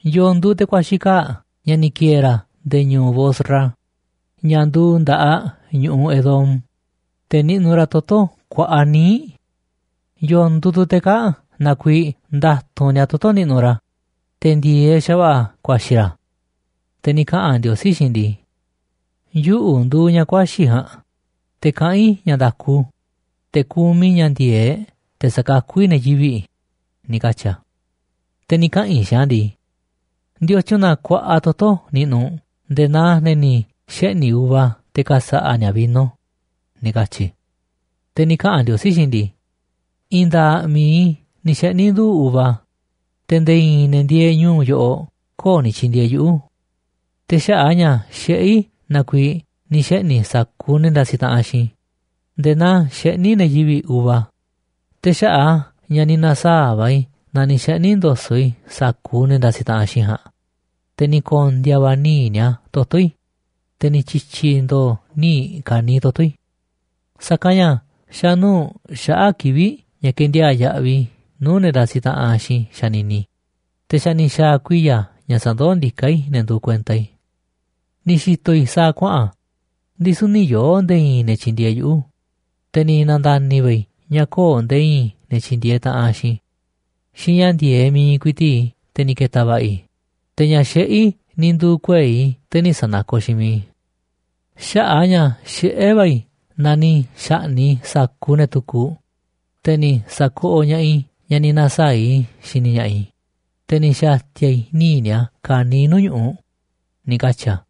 ¿Yo̱o̱ nduuꞌ te̱ ku̱a̱xi̱ kaa̱ꞌ ña̱ ni̱ ki̱e̱e̱ ra̱ nde̱e̱ ñu̱u̱ Bosra, ña̱ nduuꞌ nda̱ꞌaꞌ ñu̱ꞌuꞌ Edom, te̱ niꞌnuꞌ ra̱ toto̱ kuaꞌa níiꞌ? ¿Yo̱o̱ nduuꞌ tu̱ te̱ kaa̱ꞌ na kuiiꞌ nda̱tu̱nꞌ ni̱a̱ toto̱ niꞌnuꞌ ra̱, te̱ ndi̱e̱eꞌ xa̱va̱ꞌa̱ ku̱a̱xi̱ ra̱? Te̱ ni̱ kaꞌa̱n Ndiosí xiinꞌ i̱ ndii: “Yuꞌu̱ nduuꞌ ña̱ ku̱a̱xi̱ ja̱a̱nꞌ, te̱ kaꞌán i̱ ña̱ nda̱ku, te̱ kumiꞌ i̱ ña̱ ndi̱e̱eꞌ te̱ sa̱kakú i̱ ne̱ yivi̱ꞌ”, ni̱ katyi̱ a̱. Te̱ ni̱ kaꞌa̱n i̱ xiinꞌ a̱ ndii: “¿Ndiotyun na kuaꞌa toto̱ niꞌnuꞌ u̱nꞌ nde̱e̱ naa ne̱ ni̱ xeꞌni̱ uva te̱ ka̱sa̱ꞌa̱ ni̱a̱ vino?”, ni̱ katyi̱ i̱. Te̱ ni̱ kaꞌa̱n Ndiosí xiinꞌ i̱ ndii: “I̱i̱n nda̱a̱ꞌ mi̱iꞌ i̱ ni̱ xeꞌni̱ nduu̱ꞌ uva, te̱ nde̱e̱ i̱i̱n ne̱ ndieeꞌ ñu̱u̱ yoꞌoꞌ köo̱ꞌ ni̱ tyi̱ndi̱e̱eꞌ yuꞌu̱. Te̱ xaꞌa̱ꞌ a̱ ña̱ xiꞌé i̱ na kuiiꞌ ni̱ xeꞌni̱ i̱ sa̱kuuꞌ ne̱ ndasiꞌ taꞌanꞌ xiinꞌ i̱ nde̱e̱ naa xeꞌní ne̱ yivi̱ꞌ uva. Te̱ xaꞌa̱ꞌ a̱ ña̱ ni̱ na̱saa̱ꞌ va̱ i̱ na ni̱ xeꞌni̱ ndo̱so̱ꞌ i̱ sa̱kuuꞌ ne̱ ndasiꞌ taꞌanꞌ xiinꞌ i̱ ja̱a̱nꞌ, te̱ ni̱ ko̱ndi̱a̱ va̱ níiꞌ ni̱a̱ toto̱ i̱, te̱ ni̱ tyi̱tyi̱ ndo̱o̱ níiꞌ ka̱niiꞌ toto̱ i̱. Sa̱kanꞌ ña̱ xa̱ nuu̱ꞌ xaꞌa̱ꞌ kivi̱ꞌ ña̱ ke̱ndiaa̱ꞌ yaꞌviꞌ i̱ nuu̱ꞌ ne̱ ndasiꞌ taꞌan xiinꞌ i̱ xanini i̱, te̱ xa̱ ni̱ xa̱a̱ kuiya̱ ña̱ sa̱ndoó ndiká i̱ ne̱ nduuꞌ kuenta i̱. Ni̱ xi̱to̱ i̱ sa̱a̱ kuaꞌa̱n, ndisu̱ nï̱ yoo̱ nde̱e̱ i̱i̱n ne̱ tyi̱ndi̱e̱eꞌ yuꞌu̱, te̱ ni̱ na̱nda̱ni̱ va̱ i̱ ña̱ köo̱ꞌ nde̱e̱ i̱i̱n ne̱ tyi̱ndi̱e̱eꞌ taꞌanꞌ xiinꞌ i̱. Xiinꞌ ña̱ ndi̱e̱eꞌ mi̱iꞌ ku̱i̱ti̱ꞌ i̱ te̱ ni̱ ke̱ta̱ va̱ꞌa̱ i̱, te̱ ña̱ xiꞌé i̱ ni̱ nduu̱ kuei̱ i̱ te̱ nï̱ sa̱nakoꞌ xiinꞌ mi̱iꞌ i̱. Xaꞌa̱ꞌ a̱ ña̱ xiꞌé va̱ i̱ na ni̱ xa̱ꞌni̱ꞌ i̱ sa̱kuuꞌ ne̱ tukuꞌ, te̱ ni̱ sa̱koꞌoꞌ ña̱ꞌaꞌ i̱ ña̱ ni̱ na̱saa̱ꞌ i̱ xini ña̱ꞌaꞌ i̱, te̱ ni̱ xa̱ti̱a̱ i̱ níiꞌ ni̱a̱ ka̱niiꞌ nuu̱ꞌ ñu̱ꞌuꞌ”, ni̱ katyi̱ a̱.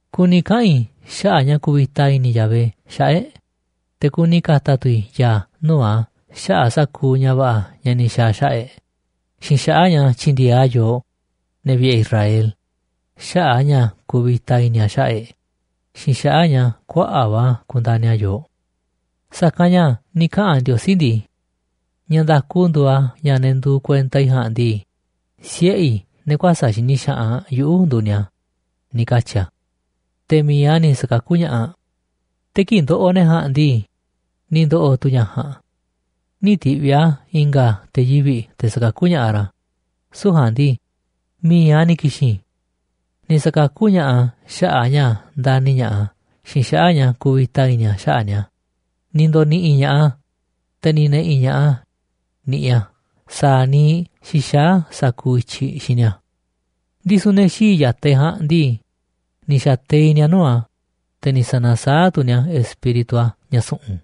Kuni kaꞌa̱n i̱ xaꞌa̱ꞌ ña̱ kuvita i̱ni̱ Yahvé xaꞌa̱ꞌ e̱ꞌ. Te̱ kuni ka̱ta̱ tu̱ i̱ ya̱a̱ nuu̱ꞌ a̱ xaꞌa̱ꞌ sa̱kuuꞌ ña̱ va̱ꞌa̱ ña̱ ni̱ xa̱a̱ a̱ xaꞌa̱ꞌ e̱ꞌ xiinꞌ xaꞌa̱ꞌ ña̱ tyi̱ndi̱e̱eꞌ a̱ yooꞌ, ne̱ vi̱ꞌe̱ Israel, xaꞌa̱ꞌ a̱ ña̱ kuvita i̱ni̱ a̱ xaꞌa̱ꞌ e̱ꞌ xiinꞌ xaꞌa̱ꞌ ña̱ kuaꞌa̱ꞌ va̱ kundani̱ a̱ yooꞌ. Sa̱kanꞌ ña̱ ni̱ kaꞌa̱n Ndiosí ndii: “Ña̱ nda̱ku nduuꞌ a̱ ña̱ ne̱ nduuꞌ kuenta i̱ ja̱a̱nꞌ ndii, siꞌe̱ i̱, ne̱ kuäsa̱ꞌ xini xaꞌanꞌ yuꞌu̱, nduuꞌ ni̱a̱”, ni̱ katyi̱ a̱. Te̱ mi̱iꞌ a̱ ni̱ sa̱kakú ña̱ꞌaꞌ a̱. Te̱ kii̱ꞌ ndoꞌoꞌ ne̱ ja̱a̱nꞌ ndii, ni̱ ndo̱ꞌo̱ tu̱ ña̱ ja̱a̱nꞌ. Nï̱ ti̱ꞌviꞌ a̱ i̱nga̱ te̱ yivi̱ꞌ te̱ sa̱kakú ña̱ꞌaꞌ ra̱, süu̱ꞌ ja̱a̱nꞌ ndii, mi̱iꞌ a̱ ni̱ ki̱xi̱n. Ni̱ sa̱kakú ña̱ꞌaꞌ a̱ xaꞌa̱ꞌ a̱ ña̱ ndani̱ ña̱ꞌaꞌ a̱ xiinꞌ xaꞌa̱ꞌ a̱ ña̱ kuvita i̱ni̱ a̱ xaꞌa̱ꞌ ni̱a̱. Ni̱ ndo̱ni̱ꞌi̱ ña̱ꞌaꞌ a̱, te̱ ni̱ ne̱ꞌi̱ ña̱ꞌaꞌ a̱ niꞌiꞌ a̱ sa̱a̱ niiꞌ xixaá a̱ sa̱kuuꞌ i̱tyiꞌ xiinꞌ ni̱a̱. Ndisu̱ ne̱ xii̱ꞌ ya̱taꞌ e̱ꞌ ja̱a̱nꞌ ndii, ni̱ xa̱teiꞌ ni̱a̱ nuu̱ꞌ a̱, te̱ ni̱ sa̱na̱saáꞌ tu̱ ni̱a̱ Espíritu a̱, ña̱ su̱ꞌu̱n.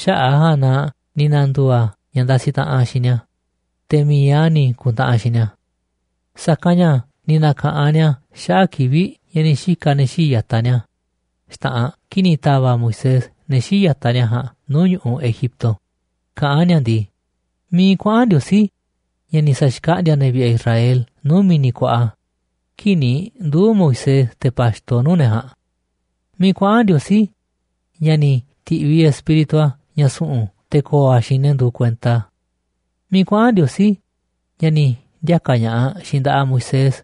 Xaꞌa̱ꞌ a̱ ja̱a̱nꞌ na ni̱ na̱ndu̱u̱ a̱ ña̱ ndasiꞌ taꞌanꞌ xiinꞌ ni̱a̱, te̱ mi̱iꞌ a̱ ni̱ ku̱ntaꞌanꞌ xiinꞌ ni̱a̱. Sa̱kanꞌ ña̱ ni̱ na̱ka̱ꞌan ni̱a̱ xaꞌa̱ꞌ kivi̱ꞌ ña̱ ni̱ xika̱ ne̱ xii̱ꞌ ya̱taꞌ ni̱a̱ xta̱ꞌanꞌ kii̱ꞌ ni̱ ta̱va̱ꞌ Moisés ne̱ xii̱ꞌ ya̱taꞌ ni̱a̱ ja̱a̱nꞌ nuu̱ꞌ ñu̱ꞌuꞌ Egipto, kaꞌán ni̱a̱ ndii: “¿Miiꞌ kuaꞌa̱n Ndiosí, ña̱ ni̱ sa̱xkaꞌndi̱a̱ ne̱ vi̱ꞌe̱ e̱ꞌ Israel nuu̱ꞌ mi̱ni̱ kuaꞌa, kii̱ꞌ ni̱ nduu̱ Moisés te̱ pa̱xto nuu̱ꞌ ne̱ ja̱a̱nꞌ? ¿Miiꞌ kuaꞌa̱n Ndiosí ña̱ ni̱ ti̱ꞌviꞌ Espíritu a̱ ña̱ su̱ꞌu̱n te̱ ko̱o̱ a̱ xiinꞌ ne̱ nduuꞌ kuenta a̱? ¿Miiꞌ kuaꞌa̱n Ndiosí ña̱ ni̱ ndiaka̱ ña̱ꞌaꞌ xiinꞌ nda̱ꞌaꞌ Moisés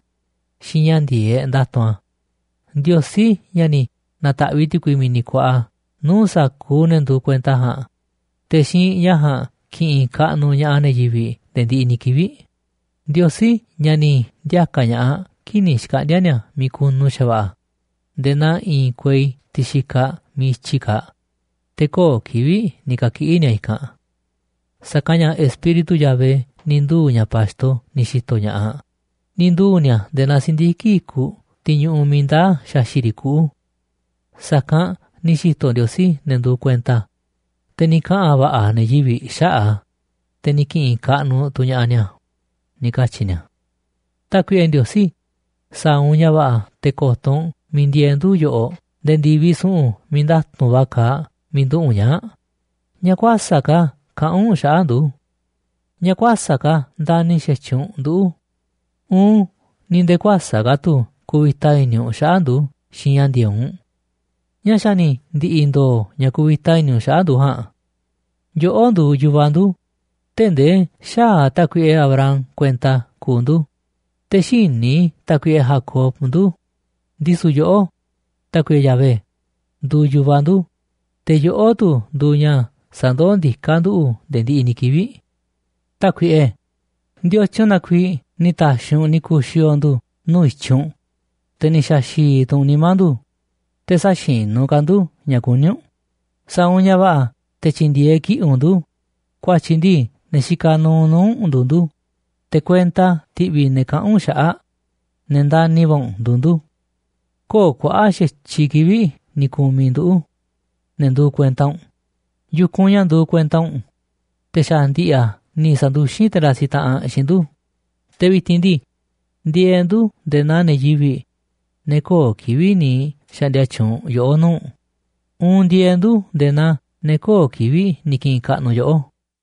xiinꞌ ña̱ ndi̱e̱eꞌ nda̱tu̱nꞌ a̱? Ndiosí ña̱ ni̱ na̱ta̱ꞌviꞌ ti̱kui mi̱ni̱ kuaꞌa nuu̱ꞌ sa̱kuuꞌ ne̱ nduuꞌ kuenta ja̱a̱nꞌ, te̱ xiinꞌ ña̱ ja̱a̱nꞌ ki̱ꞌi̱n kaꞌnuꞌ ña̱ꞌaꞌ ne̱ yivi̱ꞌ nde̱e̱ ndiꞌiꞌ ni̱ kivi̱ꞌ. Ndiosí, ña̱ ni̱ ndiaka̱ ña̱ꞌaꞌ kii̱ꞌ ni̱ xkaꞌndi̱a̱ ni̱a̱ miiꞌ kunu xa̱va̱ꞌa̱ nde̱e̱ naa i̱i̱n kuei tiꞌ xikaꞌ miiꞌ i̱tyiꞌ kaaꞌ, te̱ köo̱ꞌ kivi̱ꞌ ni̱ ka̱kiꞌi̱ ni̱a̱ i̱kanꞌ. Sa̱kanꞌ ña̱ Espíritu Yahvé ni̱ nduu̱ ña̱ pa̱xto ni̱ xi̱to̱ ña̱ꞌaꞌ. Ni̱ nduu̱ ni̱a̱ nde̱e̱ naa si̱ndiki̱ꞌ i̱kuꞌ, tiꞌ ñuꞌuꞌ miiꞌ ndaá xaxi̱ꞌ riꞌ kuꞌu̱. Sa̱kanꞌ ni̱ xi̱to̱ Ndiosí ne̱ nduuꞌ kuenta a̱, te̱ ni̱ kaꞌa̱n va̱ꞌa̱ ne̱ yivi̱ꞌ xaꞌa̱ꞌ a̱, te̱ ni̱ ki̱ꞌi̱n kaꞌnuꞌ tu̱ ña̱ꞌaꞌ ni̱a̱”, ni̱ katyi̱ ni̱a̱. Tákuiꞌe Ndiosí, sa̱a̱ u̱nꞌ ña̱ va̱ꞌa̱ te̱ ko̱to̱ u̱nꞌ miiꞌ ndieeꞌ ndu̱ yoꞌoꞌ nde̱e̱ ndi̱viꞌ su̱ꞌu̱n miiꞌ nda̱tu̱nꞌ va̱ kaaꞌ miiꞌ nduꞌu̱ꞌ u̱nꞌ ñaa̱ꞌ. ¿Ñáá kuäsa̱ꞌ ka̱ kaꞌán u̱nꞌ xaꞌa̱ꞌ ndu̱? ¿Ñáá kuäsa̱ꞌ ka̱ ndani̱ xa̱tyiꞌ u̱nꞌ nduꞌu̱ uun ni̱ nde̱e̱ kuäsa̱ꞌ ka̱ tu̱ kuvita i̱ni̱ u̱nꞌ xaꞌa̱ꞌ ndu̱ xiinꞌ ña̱ ndi̱e̱eꞌ u̱nꞌ? ¿Ñáá xa̱ ni̱ ndi̱ꞌi̱ ndo̱o̱ ña̱ kuvita i̱ni̱ u̱nꞌ xaꞌa̱ꞌ ndu̱ ja̱a̱nꞌ? Yoꞌó nduuꞌ yu̱vaꞌ ndu̱, tee̱ꞌ ndee xäaꞌ tákuiꞌe Abraham kuenta kuuꞌ ndu̱, te̱ xïní tákuiꞌe Jacob ndu̱. Ndisu̱ yoꞌó, Tákuiꞌe Yahvé, nduuꞌ yu̱vaꞌ ndu̱, te̱ yoꞌó tu̱ nduuꞌ ña̱ sandoó ndiká nduꞌu̱ nde̱e̱ ndiꞌiꞌ ni̱ kivi̱ꞌ. Tákuiꞌe, ¿ndiotyun na kuiiꞌ ni̱ ta̱xi̱ u̱nꞌ ni̱ ku̱xi̱o̱o̱ ndu̱ nuu̱ꞌ i̱tyiꞌ u̱nꞌ, te̱ ni̱ xa̱xi̱i̱ tu̱ u̱nꞌ nimá ndu̱, te̱ sä̱xinu̱ ka̱ ndu̱ ña̱ kuní u̱nꞌ? Sa̱a̱ u̱nꞌ ña̱ va̱ꞌa̱ te̱ tyi̱ndi̱e̱eꞌ kiꞌi̱ꞌ u̱nꞌ ndu̱, ku̱a̱tyi̱ ndii ne̱ xikaꞌ nuuꞌ nuu̱ꞌ u̱nꞌ nduuꞌ ndu̱, te̱ kuenta ti̱ꞌvi̱ ne̱ kaꞌán u̱nꞌ xaꞌa̱ꞌ ne̱ ndani̱ va̱ u̱nꞌ nduuꞌ ndu̱. Köo̱ꞌ kuaꞌa̱ꞌ xa̱tyiꞌ kivi̱ꞌ ni̱ ku̱miꞌ nduꞌu̱ꞌ, ne̱ nduuꞌ kuenta u̱nꞌ, yu̱kunꞌ ña̱ nduuꞌ kuenta u̱nꞌ, te̱ xa̱ ndi̱ꞌi̱ a̱ ni̱ sa̱nduxín te̱ ndasiꞌ taꞌanꞌ xiinꞌ ndu̱. Te̱ vi̱ti̱n ndii, ndieeꞌ ndu̱ꞌ nde̱e̱ naa ne̱ yivi̱ꞌ, ne̱ köo̱ꞌ kivi̱ꞌ ni̱ xa̱ꞌndi̱a̱ tyuunꞌ yoꞌó nuu̱ꞌ uun ndieeꞌ ndu̱ nde̱e̱ naa ne̱ köo̱ꞌ kivi̱ꞌ ni̱ ki̱ꞌi̱n kaꞌnuꞌ yoꞌó.